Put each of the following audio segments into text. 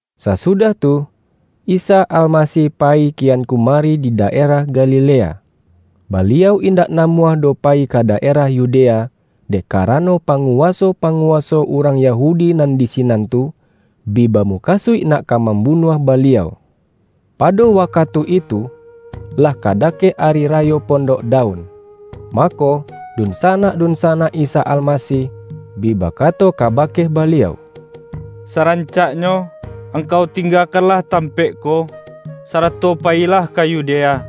Sasudah tu, Isa Almasih payi kian kumari di daerah Galilea. Baliau indak namuah doh payi ka daerah Yu-dea, dek karano, panguwaso-pangu-waso urang Yahudi nan di sinan tu, bi bamukasuik nak ka mambunuah Baliau. Pado wakatu itu, lah ka dakek Ari Rayo Pondok Daun. Mako, dunsanak-dunsanak Isa Almasih, bi bakato kaba-ke Baliau,”Sarancaknyo, Angkau ting-gakanlah tampaik ko, sarato payilah ka Yudea,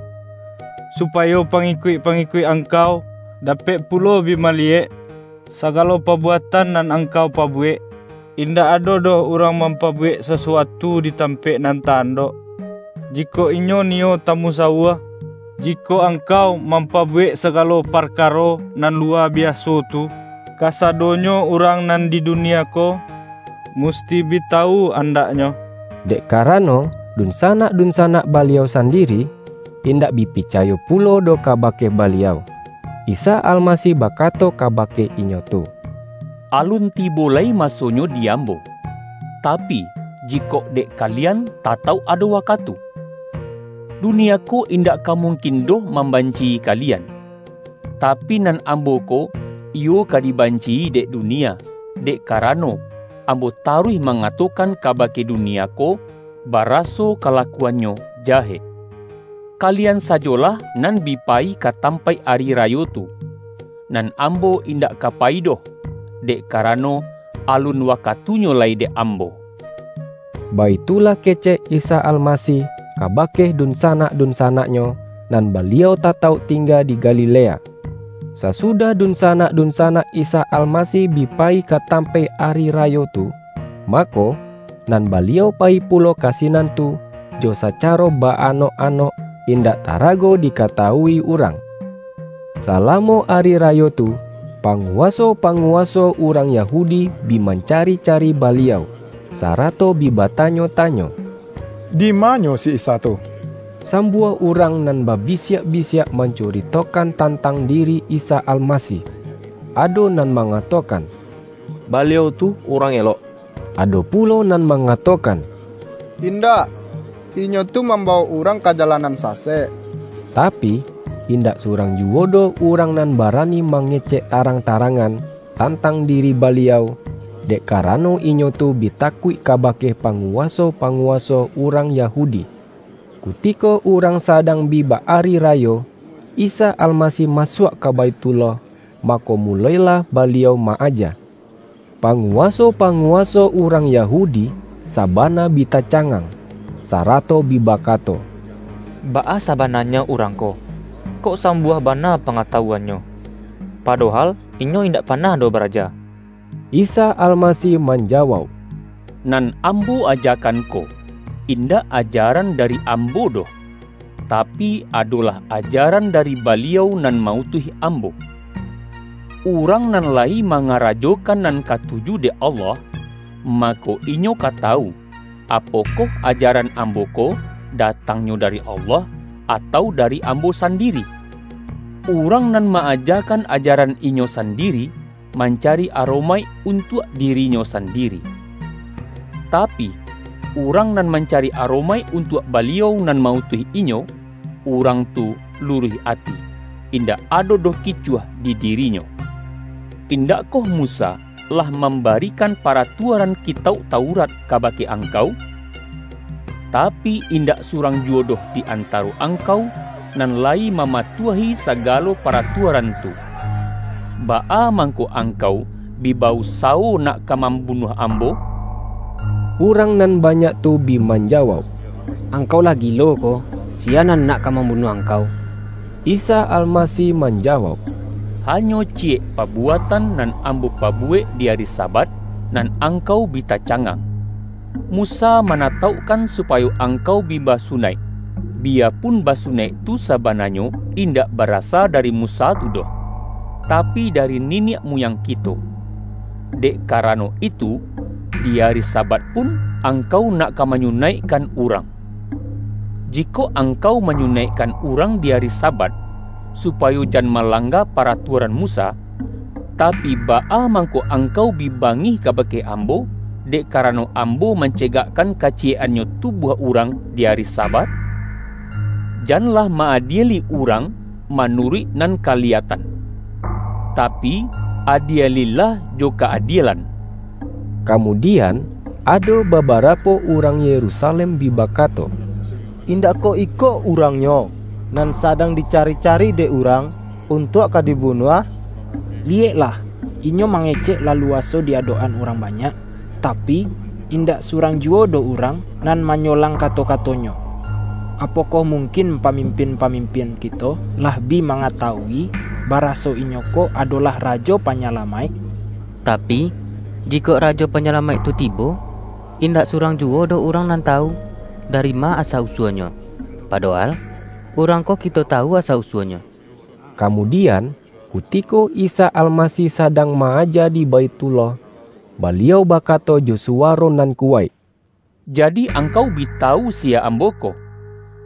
supayo pangikuik-pangikuik Angkau dapek pulo bi maliyek, sagalo pabuatan nan Angkau pabuwek. Indak ado doh urang mampabuwek sasuatu di tampaik nan ta-andok, jikok inyo niyo tamusawua. Jikok Angkau mam-pabuwek sagalo parkaro nan luwa bi-aso tu, kasadonyo urang nan di dunia ko, musti bi tawu andaknyo!” ( Dek karano, dunsanak-dunsanak Baliau sandiri, indak bi picayo pulo doh ka-bake Baliau.) Isa Almasih bakato kabake inyo tu,”Alun tibo lai masonyo di Ambo, ta-pi, jikok dek kalian tatauk ado wakatu. Dunia ko indak ka mungkin doh mambanci-i kalian. Tapi, nan Ambo ko, iyo ka dibanci-i dek dunia, dek ka-rano, Ambo taruih mangatokan kaba-ke dunia ko, baraso kalakuannyo ja-hek. Kalian sajolah nan bi payi ka tampaik ari rayo tu. Nan Ambo indak ka payi doh, dek karano, alun waka-tunyo lai dek Ambo.” Baitulah kecek Isa Almasih kabake dunsanak-dun-sanak-Nyo, nan Baliau tatauk ting-ga di Galilea. Sasudah dunsanak-dunsanak Isa Almasih bi payi ka tampaik ari ra-yo tu, mako, nan Baliau payi pulo ka sinan tu jo sacaro ba-anok-anok, in-dak tarago dikatawui urang. Sala-mo ari rayo tu, panguwaso-pangu-waso urang Yahudi bi mancari-cari Baliau, sarato bi batanyo-tanyo,”Di-manyo si Isa tu?” Sambuah urang nan babisiak-bisiak mancuritokan tantang diri Isa Almasih. Ado nan mangatokan:”Baliau tu urang elok.” Ado pulo nan mangatokan:”Indak! Inyo tu mamba-wok urang ka jalan nan sasek.” Tapi, indak surang juwo doh urang nan ba-rani mangecek tarang-tarangan, tan-tang diri Baliau, dek karano, inyo tu bi takuik kabake panguwaso-pangu-waso urang Yahudi. Kutiko urang sadang bi ba-ari ra-yo, Isa Almasih masuak ka Baithullah, mako, mulo-ilah Baliau ma-aja. panguwaso-panguwaso urang Yahu-di sabana bi tacangang, sarato bi baka-to,”Baa sabananyo Urang ko, kok sam-buah bana pangatawuan-Nyo, padohal Inyo indak panah doh baraja?” Isa Almasih manjawauk,”Nan Am-bo ajakan ko, indak ajaran dari Ambo doh, tapi, adolah ajaran dari Baliau nan ma-utuih Ambo. Urang nan la-yi mangarajokan nan katuju dek Allah, mako, inyo ka tawu, apokoh ajaran Ambo ko datangnyo dari Allah, atau dari Ambo sandiri. Urang nan ma-ajakan ajaran inyo sandiri, mancari aromaik untuak dirinyo sandiri. Ta-pi, urang nan mancari aromaik un-tuak Baliau nan ma-utuih inyo, urang tu luruih ati, indak ado doh kicuah di dirinyo. Indakkoh Musa lah mam-barikan paratuaran Kitauk Taurat ka-bake angkau? Tapi, indak surang juwo doh di antaro angkau, nan layi mama-tuahi sagalo paratuaran tu. Baa mang-ko angkau bi ba-usawo nak ka mam-bunuah Ambo?” Urang nan banyak tu bi manja-wauk,”Angkau lah gilo ko! Siya nan nak ka mambunuah Angkau?” Isa Almasih manjawauk,”Hanyo ciyek pabuatan nan Ambo pabuwek di ari Sabat, nan angkau bi tacangang. Musa manataukkan supayo ang-kau bi basunaik biyapun basunaik tu sabananyo indak barasa dari Mu-sa tu doh, tapi, dari niniak muyang kito. Dek karano itu, di ari Sabat pun angkau nak ka manyunaikkan urang. Jikok angkau manyunaikkan urang di ari Sabat, supayo jan malangga pa-ratuaran Musa, tapi, baa mangko ang-kau bi bangih kabake Ambo, dek kara-no Ambo mancegakkan kaciyek-annyo tubuah urang di ari Sabat? Janlah ma-adieli urang manuruik nan kaliya-tan, tapi, adielilah jo ka-adielan.” Kamudian, ado babarapo urang Yerusalem bi bakato,”Indak koh iko Urangnyo, nan sadang dicari-cari dek urang, untuak ka dibunuah? Liyek-lah, Inyo mangecek laluaso di adok-an urang banyak, tapi, indak surang juwo doh urang nan manyolang kato-kato-Nyo! Apokoh mungkin pamimpin-pa-mimpin kito lah bi mangatawui, bara-so Inyo ko adolah Rajo Panyalamaik? Tapi, jikok Rajo Panyalamaik tu ti-bo, indak surang juwo doh urang nan tawu, dari ma asa-usua-Nyo! Padohal, Urang ko kito tawu asa-usua-Nyo.” Kamudian, kutiko Isa Almasih sa-dang ma-aja di Baithullah, Baliau ba-kato jo suwaro nan kuwaik,”Jadi, ang-kau bi tawu siya Ambo ko,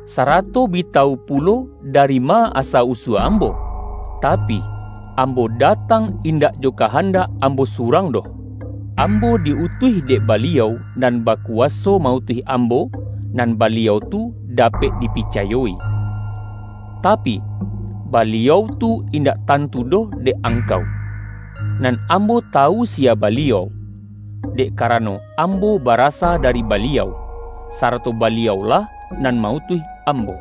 sarato bi tawu pulo dari ma asa-usua Ambo? Tapi, Ambo datang indak jo kahan-dak Ambo surang doh. Ambo di-utuih dek Baliau nan bakuwaso ma-utuih Ambo, nan Baliau tu dapek dipica-yoi. Tapi, Baliau tu indak tantu doh dek angkau. Nan Ambo tawu siya Baliau, dek karano Ambo barasa da-ri Baliau, sarato Baliau-lah nan ma-utuih Ambo.”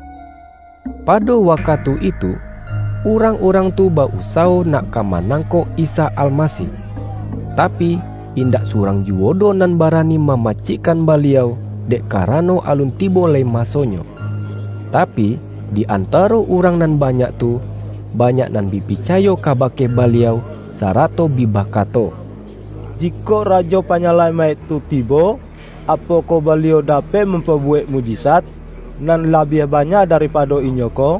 Pado wakatu itu, urang-urang tu ba-usawo nak ka manangkok Isa Almasih, tapi, indak surang juwo doh nan barani mamacikkan Baliau, dek karano, alun tibo lai masonyo. Tapi, di antaro urang nan banyak tu, banyak nan bi picayo kabake Baliau, sarato bi bakato,”Jikok Rajo Panyalamaik tu ti-bo, apokoh Baliau dapek mampabu-wek mukjizat nan labiah banyak da-ripado Inyo ko?”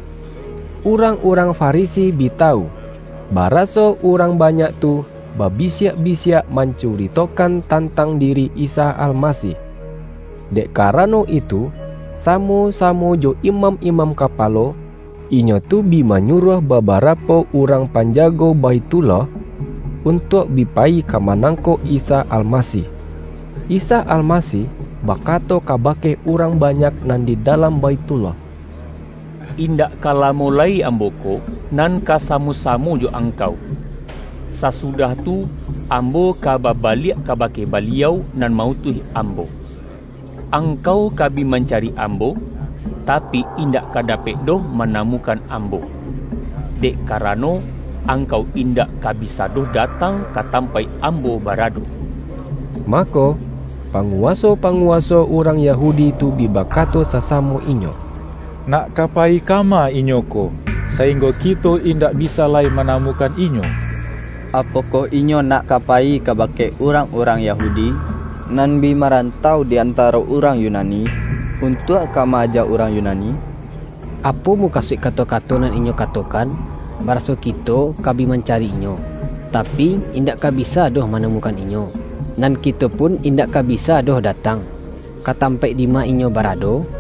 Urang-urang Farisi bi tawu, baraso urang banyak tu babisiak-bisiak man-curitokan tantang diri Isa Almasih. Dek karano itu, samo-samo jo imam-imam kapalo, inyo tu bi manyuruah babara-po urang panjago Baithullah, untuak bi payi ka manangkok Isa Almasih. Isa Almasih bakato kabake urang banyak nan di dalam Baithullah,”Indak ka la-mo lai Ambo ko, nan ka samo-samo jo angkau. Sasudah tu, Ambo ka baba-liak kabake Baliau nan ma-utuih Ambo. Angkau ka bi mancari Ambo, tapi, in-dak ka dapek doh manamukan Ambo. Dek karano, angkau indak ka bisa doh datang ka tampaik Ambo barado.” Mako, panguwaso-panguwaso urang Yahudi tu bi bakato sasamo inyo,”Nak ka payi kama Inyo ko, sa-inggo kito indak bisa lai manamukan Inyo? Apokoh Inyo nak ka payi kaba-ke urang-urang Yahudi, nan bi maran-tau di antaro urang Yunani, untuak ka ma-aja urang Yunani? Apo muka-suik kato-kato nan Inyo katokan, ba-raso kito ka bi mancari Inyo, tapi, in-dak ka bisa doh manamukan Inyo. Nan kito pun indak ka bisa doh datang, ka tampaik dima Inyo barado?”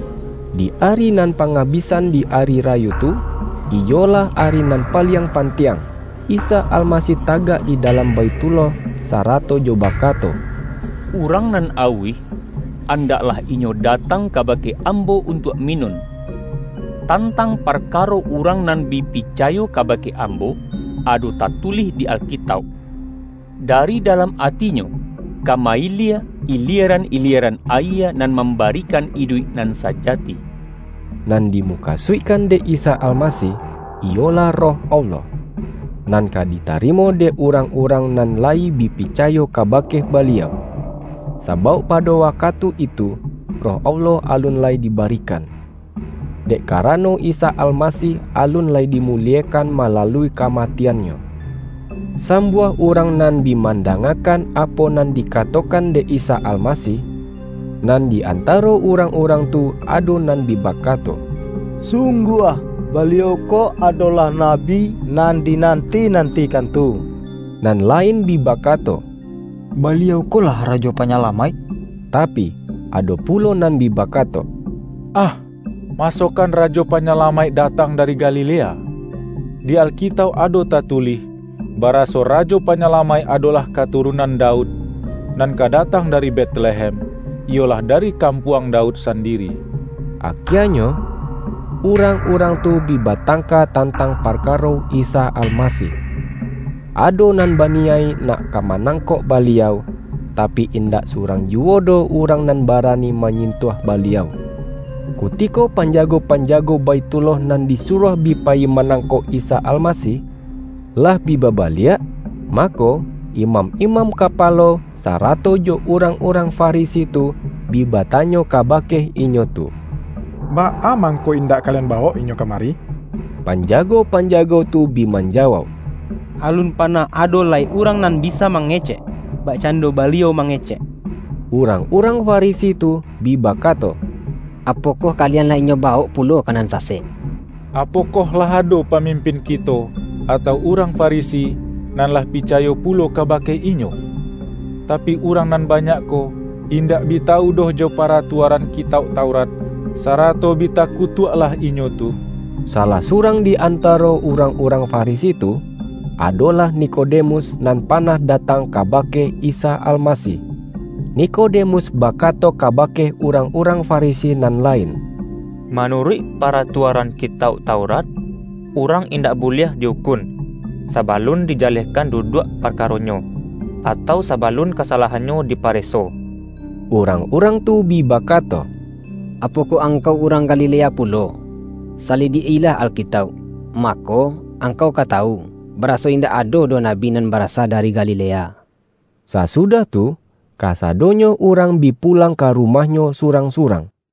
Di ari nan pangabisan di ari rayo tu, iyolah ari nan paliang pantiang, Isa Almasih tagak di dalam Baithullah, sa-rato jo bakato,”Urang nan auih, an-daklah inyo datang kabake Ambo un-tuak minun! Tantang parkaro urang nan bi picayo kabake Ambo, ado tatu-lih di Alkitauk: ’Dari dalam atinyo, ka ma-ilie ilieran-ilieran ayie nan mam-barikan iduik nan sajati.’” ( Nan di-mukasuikkan dek Isa Almasih, iyo-lah Roh Allah, nan ka ditarimo dek urang-urang nan layi bi picayo kabake Baliau. Sabauk pado wakatu itu, Roh Allah alun lai dibarikan. Dek karano, Isa Almasih alun lai dimuliekan ma-lalui kamatian-Nyo.) Sambuah urang nan bi manda-ngakan, apo nan dikatokan dek Isa Almasih, nan di antaro urang-urang tu ado nan bi bakato,”Sungguah, Baliau ko adolah Nabi nan dinanti-nantikan tu!” Nan lain bi bakato,”Baliau ko lah Rajo Panyalamaik!” Tapi, ado pulo nan bi bakato,”Ah, ma-sokan Rajo Panyalamaik datang dari Galilea? Di Alkitauk ado tatulih, ba-raso Rajo Panyalamaik adolah katurun-an Daud, nan ka datang dari Betlehem, iyolah dari kampuang Daud sandiri.” Akienyo urang-urang tu bi batangka tantang parkaro Isa Almasih. Ado nan baniyaik nak ka manangkok Ba-liau, tapi, indak surang juwo doh urang nan barani manyintuah Baliau. Kutiko panjago-panjago Baithullah nan disuruah bi payi manangkok Isa Almasih, lah bi babaliak, mako, imam imam kapalo, sarato jo urang-urang Fa-risi tu, bi batanyo kabake inyo tu,”Baa mangko indak kalian bawok Inyo ka-mari?” Panjago-panjago tu bi manjawauk,”Alun panah ado lai urang nan bisa mangecek, bakcando Baliau mange-cek!” Urang-urang Farisi tu bi bakato,”Apokoh kalian lah Inyo bawok pulo ka nan sasek?” ”Apokoh lah ado pamim-pin kito, atau urang Farisi, nan lah pica-yo pulo kabake Inyo? Tapi, urang nan banyak ko, indak bi tawu doh jo para-tuaran Kitauk Taurat, sarato bi taku-tuaklah inyo tu.” Salah surang di antaro urang-urang Farisi tu, adolah Nikodemus, nan panah datang kabake Isa Almasih. Nikodemus bakato kabake urang-urang Farisi nan lain, ”Manuruik paratua-ran Kitauk Taurat, urang indak buliah di-ukun, sabalun dijalehkan duduak parkaronyo, atau sabalun kasalahan-nyo dipareso.” Urang-urang tu bi bakato:”Apo-koh angkau urang Galilea pulo? Sali-diak-ilah Alkitauk, mako, angkau ka tawu, baraso indak ado doh nabi nan barasa dari Galilea!” [ Sasudah tu, kasadonyo urang bi pulang ka rumahnyo surang-surang. YAHYA